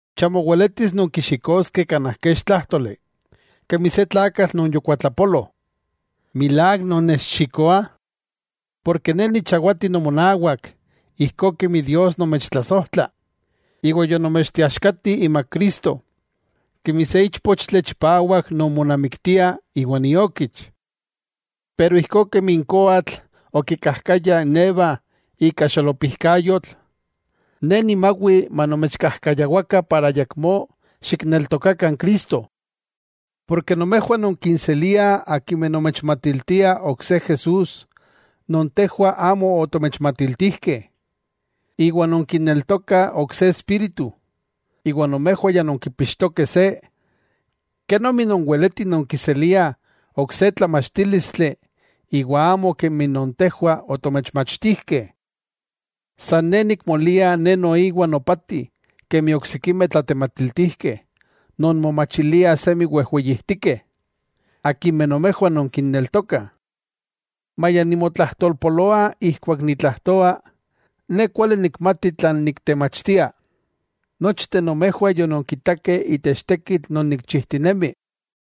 Chamo weletis nonkixikoskeh kanaj kech tlájtoli, kemi se tlakatl non yokuatlapolo, milák nonnechxikoah. Ne nichawati nomonawak ijkó kemi Dios nomechtlasojtla, iwa yonomechteaxkati imak Cristo, kemi se íchpochtli chipawak non monamiktia iwan iokich. Iwa ijkó kemi n koatl okikajkaya n Eva ika xolopijkayotl, ne nimawi manomechkajkayawakah iwa ayakmó xikneltokakah n Cristo. Nomejwah nonkinseliah akimeh nomechmatiltiah ok se Jesús non tejwah amo otomechmatiltijkeh. Iwa nonkineltokah ok se espíritu, iwa nomejwah ya nonkipixtokeh se. Kenomi nonweletih nonkiseliah ok se tlamachtílistli iwa amo kemi non tejwah otomechmachtijkeh. San ne nikmolia ne noiwa nopati kemi n oksikimeh tlatematiltijkeh non momachiliah semi wejweyijtikeh, akimeh nomejwah nonkinneltokah. Maya nimotlajtolpoloa ijkuak nitlajtoa, ne kuali nikmati tlan niktemachtia. Nochteh nomejwah yononkitakeh itech tekitl non tikchijtinemih.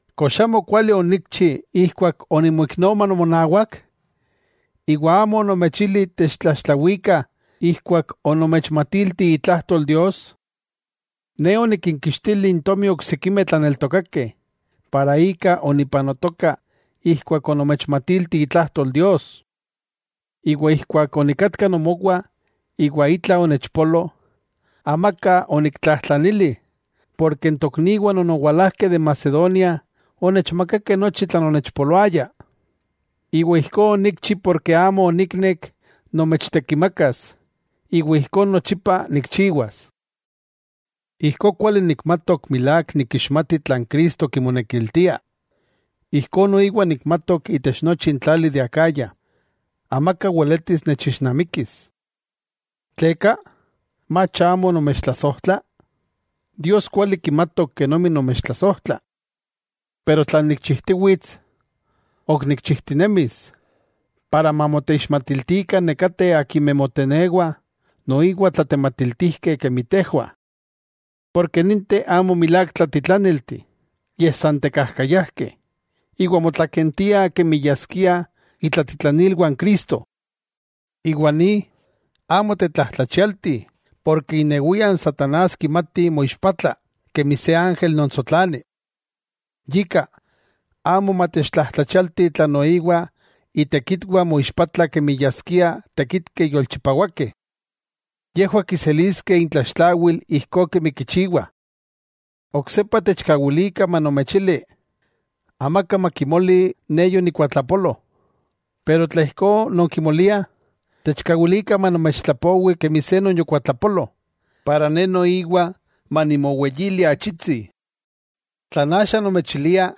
¿Kox amokuali onikchi ijkuak onimoiknoma nomonawak, iwa amo onomechili techtlaxtlawikah ijkuak onomechmatilti itlajtol Dios? Ne onikinkixtili n tomi oksikimeh tlaneltokakeh, iwa ika onipanotoka ijkuak onomechmatilti itlajtol Dios. Keman onikatka nomowah iwa itla onechpolo, amaka oniktlajtlanili porke n tokniwah non owalajkeh de Macedonia onechmakakeh nochi tlan onechpoloaya. Iwa ijkó onikchi porke amo oniknek nomechtekimakas, iwa ijkó nochipa nikchiwas. Ijkó kuali nikmatok milák nikixmati tlan Cristo kimonekiltia, ijkó noiwa nikmatok itech nochi n tlali de Acaya, amaka weletis nechixnamikis. ¿Tleka? ¿Mach amo nomechtlasojtla? Dios kuali kimatok kenomi nomechontlasojtla. Pero tlan nikchijtiwits, ok nikchijtinemis, para mamoteixmatiltikah nekateh akimeh motenewah noiwa tlatematiltijkeh kemi tejwah. Porke ninteh amo milák tlatitlaniltih, yej san tekajkayajkeh, iwa motlakentiah kemi yaskiah itlatitlanilwah n Cristo. Iwa ni, amo tetlajtlachialti porke inewia n satanás kimati moixpatla kemi se ángel non tsotlani. Yika, amo matechtlajtlachialti tla noiwa itekitwah moixpatlah kemi yaskiah tekitkeh yolchipawakeh. ¡Yejwah kiseliskeh intlaxtlawil ijkó kemi kichiwah! Oksepa techkawilikah manomechili: Amaka makimoli ne yonikuatlapolo, tla ijkó non kimoliah, techkawilikah manomechtlapowi kemi se non yokuatlapolo, iwa ne noiwa manimoweyili achitsi. Tlan axa nomechilia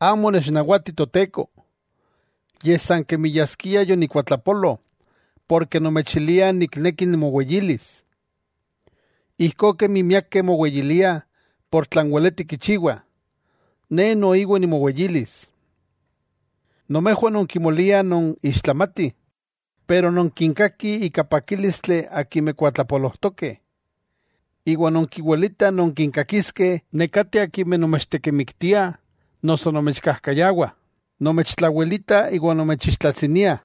amo onechnawati Toteko, yej san kemi yaskia yonikuatlapolo porke nomechilia nikneki nimoweyilis. Ijkó kemi miakeh moweyiliah por tlan weletih kichiwah, ne noiwa nimoweyilis. Nomejwah non kimoliah non ixtlamatih, iwa non kinkakih ika pakílistli akimeh kuatlapolojtokeh. Iwa nonkiwilitah nonkinkakiskeh nekateh akimeh nomechtekimiktiah noso nomechkajkayawah, nomechtlawelitah iwa nomechixtlatsiniah.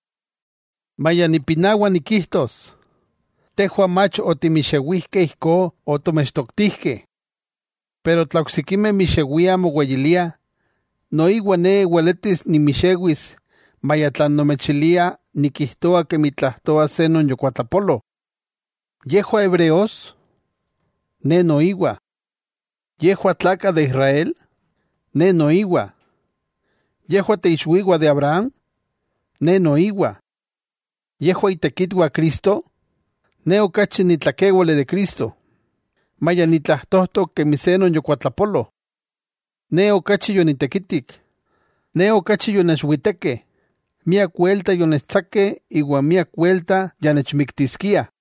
Maya nipinawa nikijtos, ¡tejwah mach otimixewijkeh ijkó otomechtoktijkeh! Tla oksikimeh mixewiah moweyiliah, noiwa ne weletis nimixewis maya tlan nomechilia nikijtoa kemi tlajtoa se non yokuatlapolo. ¿Yejwah hebreos? Ne noiwa. ¿Yejwah tlakah de Israel? Ne noiwa. ¿Yejwah teixwiwah de Abraham? Ne noiwa. ¿Yejwah itekitwah Cristo? Ne okachi ni tlakéwali de Cristo, maya nitlajtojtok kemi se non yokuatlapolo. Ne okachi yonitekitik, ne okachi yonechwitekeh, miak welta yonechtsakeh, iwa miak welta ya nechmiktiskiah.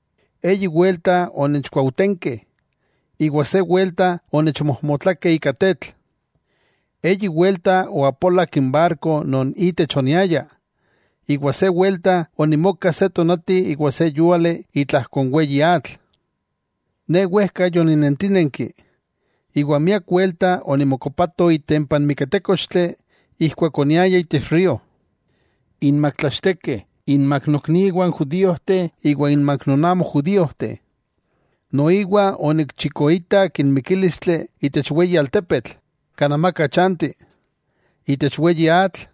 Eyi welta onechkuaujtenkeh, iwa se welta onechmojmotlakeh ika tetl. Eyi welta oapolak n barko non itech oniaya, iwa se welta onimoka se tonati iwa se yúali itlajko n weyi atl. Ne wejka yoninentínenki, iwa miak welta onimokokopato itempa n miketékochtli ijkuak oniaya itech río, inmak tlachtekeh, inmak nokniwah n judíojteh iwa inmak non amo judíojteh. Noiwa onikchikoitak n mikílistli itech weyi altepetl, kan amaka chanti, itech weyi atl,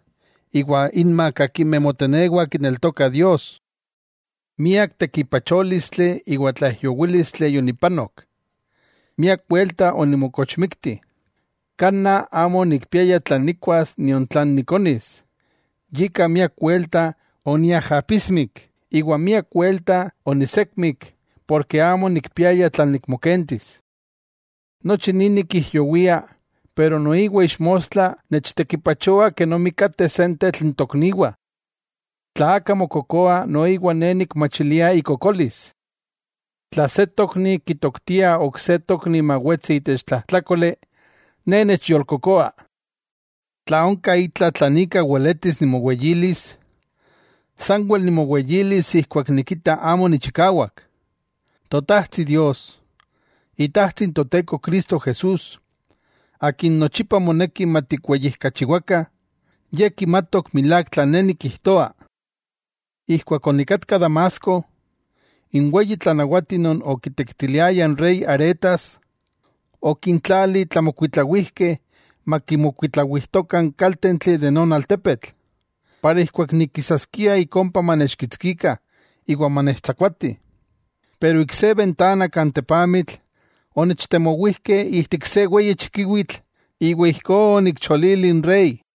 iwa inmak akimeh motenewah kineltokah Dios. Miak tekipachólistli iwa tlaijyowílistli yonipanok. Miak welta onimokochmikti, kanaj amo onikpiaya tlan nikkuas nion tlan nikonis, yika miak welta oniajapismik, iwa miak welta onisekmik porke amo onikpiaya tlan nikmokentis. Nochi ni nikijyowia, pero noiwa ixmostla nechtekipachoa kenomi kateh sentetl n tokniwah. Tla aka mokokoa noiwa ne nikmachilia ikokolis. Tla se tokni kitoktia ok se tokni mawetsi itech tlajtlákoli, ne nechyolkokoa. Tla onka itla tlan ika weletis nimoweyilis, sanwel nimoweyilis ijkuak nikita amo nichikawak. Totajtsi Dios, Itajtsi n Toteko Cristo Jesús, Akin nochipa moneki matikweyijkachiwakah, Ye kimatok milák tlan ne nikijtoa. Ijkuak onikatka Damasco, n weyi tlanawati non okitekitiliaya n rey Aretas, okintlali tlamokuitlawijkeh makimokuitlawijtokah n kaltentli de non altepetl, para ijkuak nikisaskia ik ompa manechkitskikah iwa manechtsakuatih, pero ik se bentana kan tepamitl, onechtemowijkeh ijtik se weyi chikiwitl, iwa ijkó onikcholili n rey.